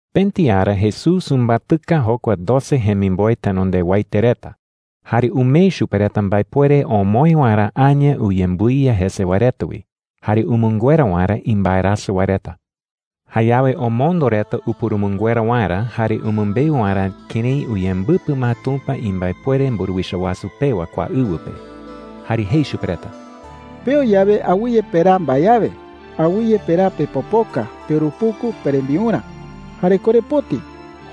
Pëti ara Jesús umbatɨka jokua doce jemimboe tenondewaete reta, jare umee chupe reta mbaepuere omoë waerä aña uyembɨiya jese wae reta wi jare umɨnguera waerä imbaerasɨ wae reta. Jayawe omondo reta upurumɨnguera waerä jare umɨmbeu waerä kërái uyembɨpɨ ma Tumpa imbaepuere mburuwicha wasu pewa kua ɨwɨ pe. Jare jei chupe reta: “Peo yawe, awɨye peraa mbae awe. Awɨye peraa pepopoka, peurupuku, perembiurä, jare korepoti.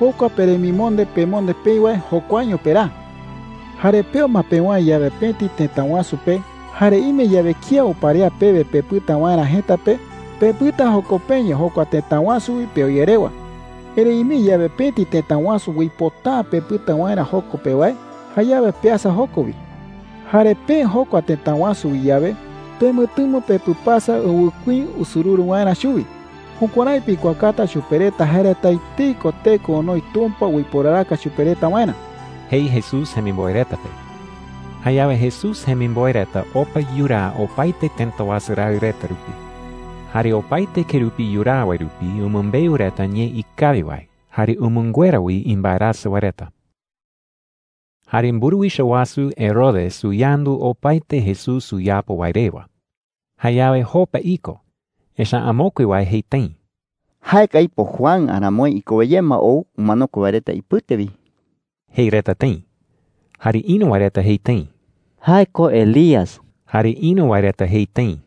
Jokua peremimonde pemonde peï wae, jokuaño peraa,” jei chupe reta. “Jare peo ma pewäe yawe pëti tëta wasu pe, jare ime yawe kía uparea pewe pepɨta waerä jëta pe, pepɨta joko peño jokua tëta wasu wi peo ye rewa,” jei. “Erëi ime yawe pëti tëta wasu uipota’ä pepɨta waerä joko pe wae, jayawe peasa joko wi,” jei. “Jare peë jokua tëta wasu wi yawe, pemɨtɨmo pepɨpasa ɨwɨkuí usururu waerä chuwi. Jukuärái pikuaakata chupe reta jae reta etei ko teko onoi Tumpa uiporaraka chupe reta waerä,” jei Jesús jemimboe reta pe. Jayawe Jesús jemimboe reta opa yuraa opaete tëta wasu raɨ reta rupi. Jare opaete kerupi yuraa wae rupi umɨmbeu reta ñee ikawi wae jare umɨnguera wi imbaerasɨ wae reta. Jare mburuwicha wasu Herodes uyandu opaete Jesús uyapo wae rewa. Jayawe jopa iko, echa’ä amokue wae jei tëi: “Jae ko aipo Juan aramoi ikowe ye ma ou umanokue wae reta ipɨte wi,” jei reta tëi. Jare ïru wae reta jei tëi: “Jae ko Elías.” Jare ïru wae reta jei tëi: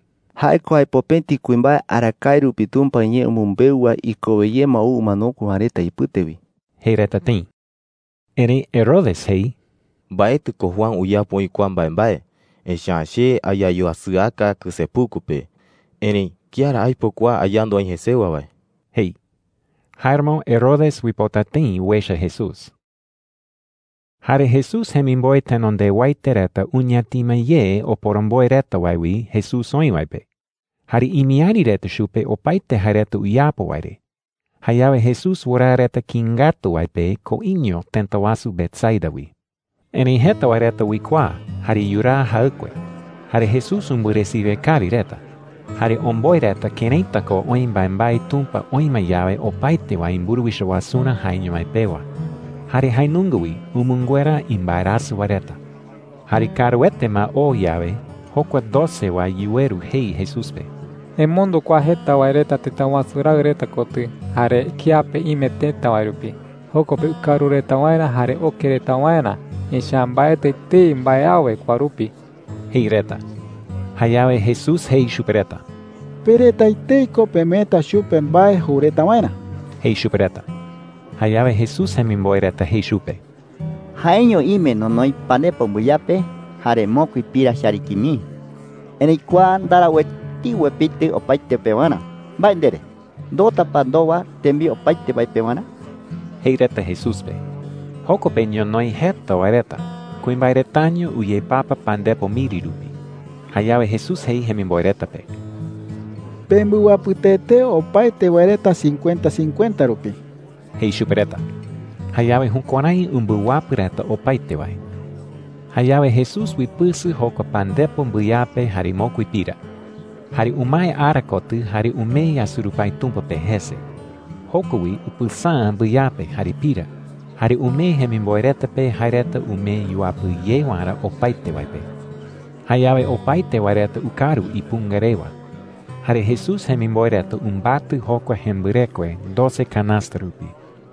“Jae ko aipo pëti kuimbae arakae rupi Tumpa iñee umɨmbeu wae ikowe ye ma ou umanokue wae reta ipɨte wi,” jei reta tëi. Erëi Herodes jei: “Mbaetɨ ko Juan uyapo oï kua mbaembae, echa’ä che ayayuasɨaka kɨsepuku pe. Erëi ¿kía ra aipo kua ayandu aï jesewa wae?” jei. Jáeramo Herodes uipota tëi uecha Jesús. Jare Jesús jemimboe tenondewaete reta uñatima ye oporomboe reta wae wi Jesús oï wae pe. Jare imiäri reta chupe opaete jae reta uyapo wae re. Jayawe Jesús wɨraa reta kïi ngatu wae pe koiño tëta wasu Betsaida wi. Erëi jeta wae reta uikuaa jare yuraa jaɨkue. Jare Jesús umbɨresiwe kawi reta, jare omboe reta këraita ko oï mbaembae Tumpa oï ma yawe opaete wae imburuwicha wasurä jaeño mái pewa. Jare jae nunga wi umɨnguera imbaerasɨ wae reta. Jare kaaruete ma oo yawe, jokua doce wae yuweru jei Jesús pe: “Emondo kua jeta wae reta tëta wasu raɨ reta kotɨ jare kiape ime tëta wae rupi, joko pe ukaru reta waerä jare oke reta waerä. Echa’ä mbaetɨ etei mbae awe kua rupi,” jei reta. Jayawe Jesús jei chupe reta: “Pe reta etei ko pemeeta chupe mbae jou reta waerä,” jei chupe reta. Jayawe Jesús jemimboe reta jei chupe: “Jaeño ime nonoi pandepo mbɨyape jare mokui pira chariki mii,” jei reta. “Erëi kua ndarau etei uepitɨ opaete pewarä. ¿Mbae ndere? ¿Ndoota pa ndowa tembiu opaete wae pewarä?” jei reta Jesús pe. Joko pe ñonoï jeta wae reta. Kuimbae retaño uyepapa pandepo miri rupi. Jayawe Jesús jei jemimboe reta pe: “Pembɨwapɨ tee tee opaete wae reta cincuenta cincuenta rupi,” jei chupe reta. Jayawe jukuärái umbɨwapɨ reta opaete wae. Jayawe Jesús uipɨsɨ jokua pandepo mbɨyape jare mokui pira. Jare umae ara kotɨ jare umee yasurupái Tumpa pe jese. Joko wi upɨsäa mbɨyape jare pira, jare umee jemimboe reta pe jae reta umee yuapɨ ye waerä opaete wae pe. Jayawe opaete wae reta ukaru ipunga rewa. Jare Jesús jemimboe reta umbatɨ jokua jembɨrekue doce kanasta rupi.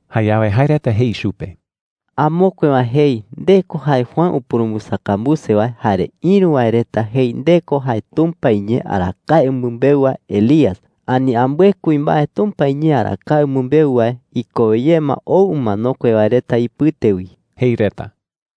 Jayawe jae reta jei chupe: “Amokue wae jei nde ko jae Juan upurumbɨsakambuse wae. Jare ïru wae reta jei nde ko jae Tumpa iñee arakae umɨmbeu wae Elías, ani ambɨe kuimbae Tumpa iñee arakae umɨmbeu wae ikowe ye ma ou umanokue wae reta ipɨte wi,” jei reta.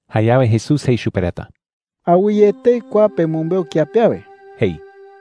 Jayawe Jesús jei chupe reta: “Awɨye etei kua pemɨmbeu kía pe awe,” jei.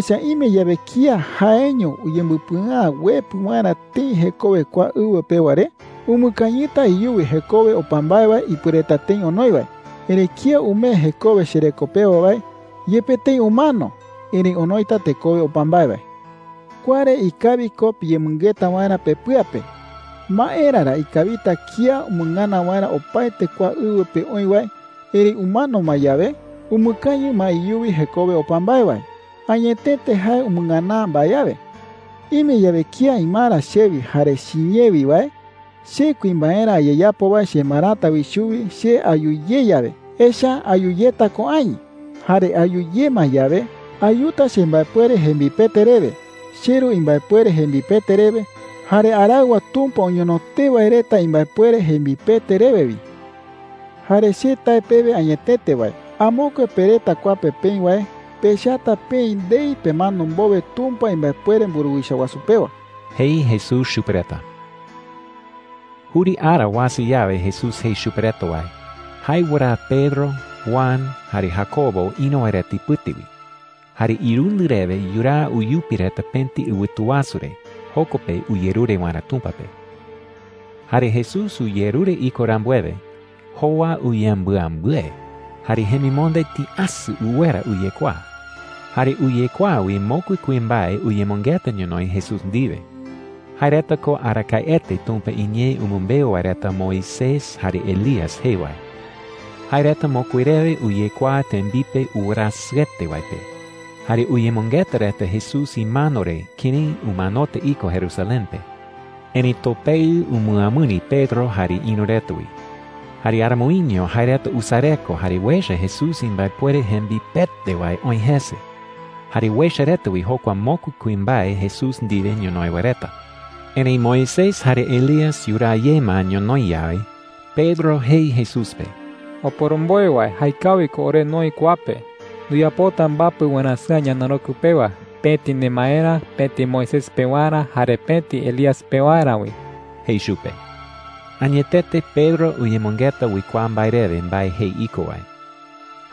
“Echa’ä ime yawe kía jaeño uyembɨpɨa’ä uepɨ waerä tëi jekowe kua ɨwɨ pewa re, umɨkañɨta iyuwi jekowe opa mbae wae ipuereta tëi onoi wae. Erëi kía umee jekowe chereko pewa wae, yepe tëi umano, erëi onoita tekowe opa mbae wae,” jei chupe reta. “Kua re ikawi ko piyemɨngeta waerä pepɨa pe. ¿Maera ra ikawita kía umɨngana waerä opaete kua ɨwɨ pe oï wae, erëi umano ma yawe, umɨkañɨ ma iyuwi jekowe opa mbae wae? Añetete jae umɨngana’ä mbae awe,” jei. “Ime yawe kía imara chewi jare chiñee wi wae, che kuimbaerä ayeyapo wae chemarata wi chuwi che ayu ye yawe. Echa’ä ayu yeta ko aï. Jare ayu ye ma yawe, ayuta chembaepuere jembipete rewe, cheRu imbaepuere jembipete rewe, jare araɨwa Tumpa oñono tee wae reta imbaepuere jembipete rewe wi,” jei chupe reta. “Jare che tae pewe añetete wae, amokue pe reta kua pe peï wae pechata peï ndei pemano mbowe Tumpa imbaepuere mburuwicha wasu pewa,” jei Jesús chupe reta. Juri ara uasa yawe Jesús jei chupe reta wae, jae wɨraa Pedro, Juan, jare Jacobo ïru wae reta ipɨte wi. Jare irundɨ rewe yuraa uyupi reta pëti ɨwɨtu wasu re, joko pe uyerure waerä Tumpa pe. Jare Jesús uyerure iko rambuewe, jowa uyembɨambɨe jare jemimonde tïasɨ uwera uyekuaa. Jare uyekuaa wi mokui kuimbae uyemɨngeta ñonoï Jesús ndiwe. Jae reta ko arakaete Tumpa iñee umɨmbeu wae reta Moisés jare Elías jee wae. Jae reta mokui rewe uyekuaa tembipe uwerasɨete wae pe, jare uyemɨngeta reta Jesús imano re kërái umanota iko Jerusalén pe. Erëi topeɨ umɨamɨri Pedro jare ïru reta wi. Jare aramoiño jae reta usareko jare uecha Jesús imbaepuere jembipete wae oï jese. Jare uecha reta wi jokua mokui kuimbae Jesús ndiwe ñonoï wae reta. Erëi Moisés jare Elías yuraa ye ma ñonoï yawe, Pedro jei Jesús pe: “Oporomboe wae, jaekawi ko ore noï kua pe,” jei chupe. “Nduyapota mbapɨ warasɨ̈a ñanarokɨ pewa – pëti nemaerä, pëti Moisés pewarä, jare pëti Elías pewarä wi,” jei chupe. Añetete Pedro uyemɨngeta uikuaa mbae rewe mbae jei iko wae.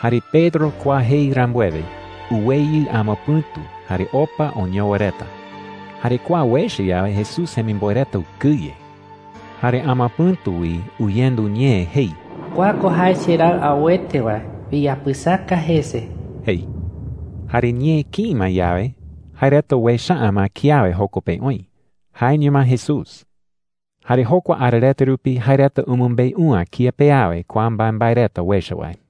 Jare Pedro kua jei rambuewe, uweyɨ amapɨ̈tu jare opa oñowa reta. Jare kua uecha yawe, Jesús jemimboe reta ukɨye. Jare amapɨ̈tu wi uyendu ñee jei: “Kua ko jae cheRaɨ auete wae. Piyapɨsaka jese,” jei. Jare ñee kïi ma yawe, jae reta uecha’ä ma kiawe joko pe oï – jaeño ma Jesús. Jare jokua ara reta rupi jae reta umɨmbeu’ä kía pe awe kua mbaembae reta uecha wae.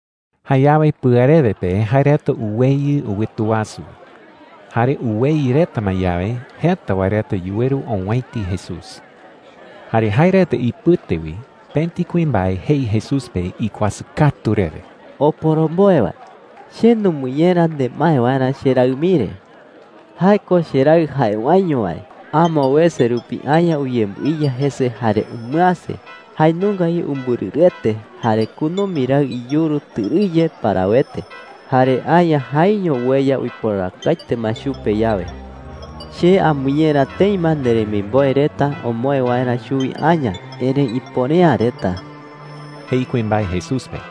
Jayawe pɨarewe pe jae reta uweyɨ ɨwɨtu wasu wi. Jare uweyɨ reta ma yawe, jeta wae reta yuweru owäiti Jesús. Jare jae reta ipɨte wi pëti kuimbae jei Jesús pe ikuasɨ katu rewe: “Oporomboe wae, che numɨñera nemae waerä cheraɨ mii re,” jei. “Jae ko cheraɨ jae waeño wae. Amo wese rupi aña uyembɨiya jese jare umɨäse. Jae nunga wi umbɨrɨrɨete, jare kunumi raɨ iyuru tɨrɨye parawete. Jare aña jaeño ueya uiporarakaete ma chupe yawe,” jei. “Che amɨñera tëi ma nderemimboe reta omoë waerä chuwi aña, erëi ipuere’ä reta,” jei kuimbae Jesús pe.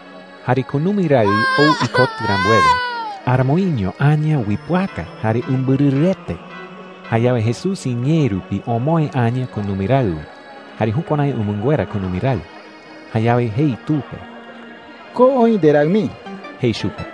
Jare kunumi raɨ ou ikotɨ rambuewe, aramoiño aña uipɨaka jare umbɨrɨrɨete. Jayawe Jesús iñee rupi omoë aña kunumi raɨ wi jare jukuärái umɨnguera kunumi raɨ. Jayawe jei tu pe: “Ko oï nderaɨ mii,” jei chupe.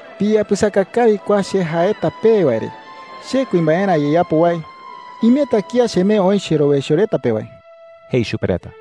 “Piyapɨsaka kawi kua che jaeta pewe wae re. Che kuimbaerä ayeyapo wae, imeta kía chemee oï cherowaicho reta pe wae,” jei chupe reta.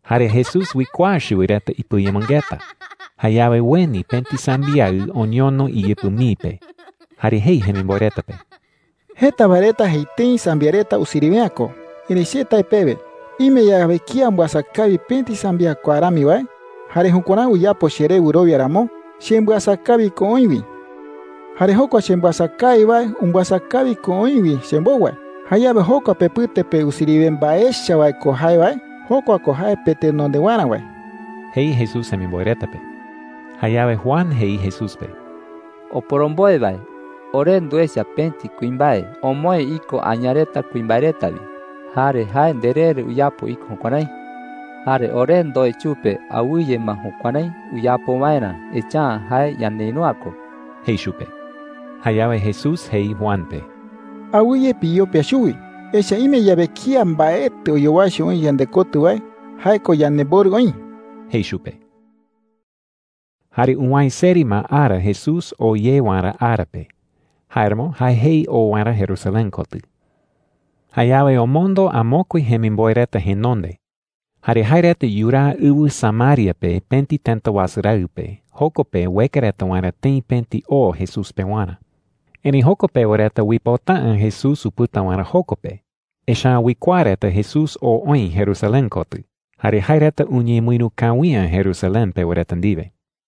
Jare Jesús uikuaa chuwi reta ipɨayemɨngeta. Jayawe ueni pëti sambiaɨ oñono iyɨpɨ mii pe. Jare jei jemimboe reta pe: “Jeta wae reta jei tëi sambiaɨ reta usiriwe’ä ko. Erëi che tae pewe, ime yawe kía umbɨasa kawi pëti sambiaɨ kua rami wae, jare jukuärái uyapo cheré wɨrowia ramo, chembɨasa kawi ko oï wi,” jei. “Jare jokua chembɨasa kawi wae, umbɨasa kawi ko oï wi chembou wae. Jayawe jokua pepɨte pe usiriwe mbae echa wae ko jae wae, jokua ko jae petenondewarä wae,” jei Jesús jemimboe reta pe. Jayawe Juan jei Jesús pe: “Oporomboe wae, ore nduecha pëti kuimbae omoë iko aña reta kuimbae reta wi. Jare jae nderee re uyapo iko jukuärái,” jei. “Jare ore ndoe chupe awɨye ma jukuärái uyapo waerä, echa’ä jae ñaneïru’ä ko,” jei chupe. Jayawe Jesús jei Juan pe: “Awɨye piyopia chuwi. Echa’ä ime yawe kía mbaetɨ oyowaicho oï yandekotɨ wae, jae ko yanemborɨ oï,” jei chupe. Jare uwäe seri ma ara Jesús oo ye waerä ara pe. Jáeramo jae jei oo waerä Jerusalén kotɨ. Jayawe omondo amokue jemimboe reta jenonde. Jare jae reta yuraa ɨwɨ Samaria pe pëti tëta wasu raɨ pe, joko pe ueka reta waerä tëi pëti o Jesús pewarä. Erëi joko pewa reta uipota’ä Jesús upɨta waerä joko pe. Echa’ä uikuaa reta Jesús oo oï Jerusalén kotɨ, jare jae reta uñemɨïru kawi’ä Jerusalén pewa reta ndiwe.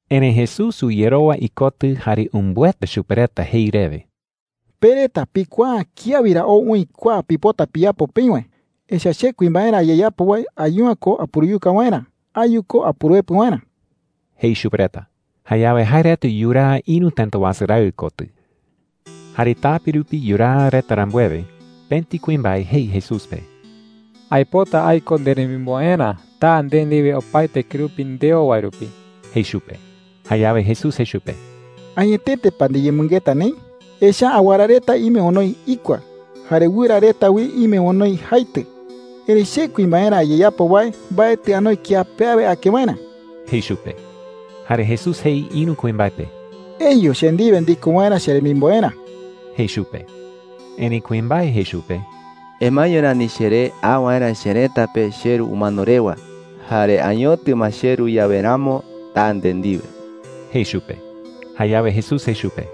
Erëi Jesús uyerowa ikotɨ jare umbɨeta chupe reta jei rewe: “Pe reta pikuaa’ä kía wi ra ou oï kua pipota piyapo peï wae. Echa’ä che kuimbaerä ayeyapo wae ayu’ä ko apuruyuka waerä. Ayu ko apuruepɨ waerä,” jei chupe reta. Jayawe jae reta yuraa ïru tëta wasu raɨ kotɨ. Jare tape rupi yuraa reta rambuewe, pëti kuimbae jei Jesús pe: “Aipota aiko nderemimboerä. Taa nde ndiwe opaete kerupi ndeo wae rupi,” jei chupe. Jayawe Jesús jei chupe: “¿Añetete pa ndiyemɨngeta neï? Echa’ä awara reta ime onoi ikua, jare wɨra reta wi ime onoi jaitɨ. Erëi che kuimbaerä ayeyapo wae mbaetɨ anoi kiape awe ake waerä,” jei chupe. Jare Jesús jei ïru kuimbae pe: “Eyu che ndiwe ndiko waerä cheremimboerä,” jei chupe. Erëi kuimbae jei chupe: “Emaeño rani cheré a waerä cherëta pe cheru umano rewa. Jare añotɨ ma cheru yawe ramo taa nde ndiwe,” jei chupe. Jayawe Jesús jei chupe: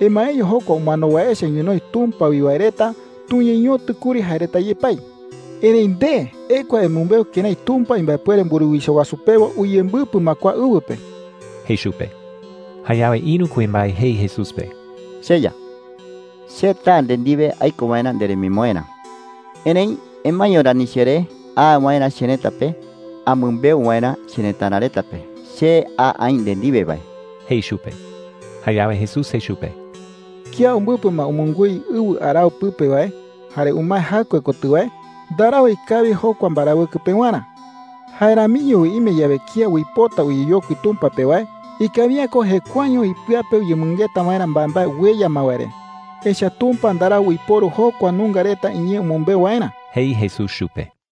“Emaeño jokua umano wae echa ñonoï Tumpa wi wae reta tuñeñotɨ kuri jae reta yepái,” jei chupe. “Erëi nde, ekua emɨmbeu kërái Tumpa imbaepuere mburuwicha wasu pewa uyembɨpɨ ma kua ɨwɨ pe,” jei chupe. Jayawe ïru kuimbae jei Jesús pe: “CheYa, che taa nde ndiwe aiko waerä nderemimboerä. Erëi emaeño rani cheré a waerä cherëta pe amɨmbeu waerä cherëtara reta pe che a aï nde ndiwe wae,” jei chupe. Jayawe Jesús jei chupe: “Kía umbɨpɨ ma umungúi ɨwɨ arao pɨpe wae jare umae jaɨkue kotɨ wae, ndarau ikawi jokua mbarawɨkɨ pewarä. Jae ramiño wi ime yawe kía uipota uyeyokui Tumpa pe wae, ikawi’ä ko jekuaeño ipɨa pe uyemɨngeta waerä mbaembae ueya ma wae re. Echa’ä Tumpa ndarau uiporu jokua nunga reta iñee umɨmbeu waerä,” jei Jesús chupe.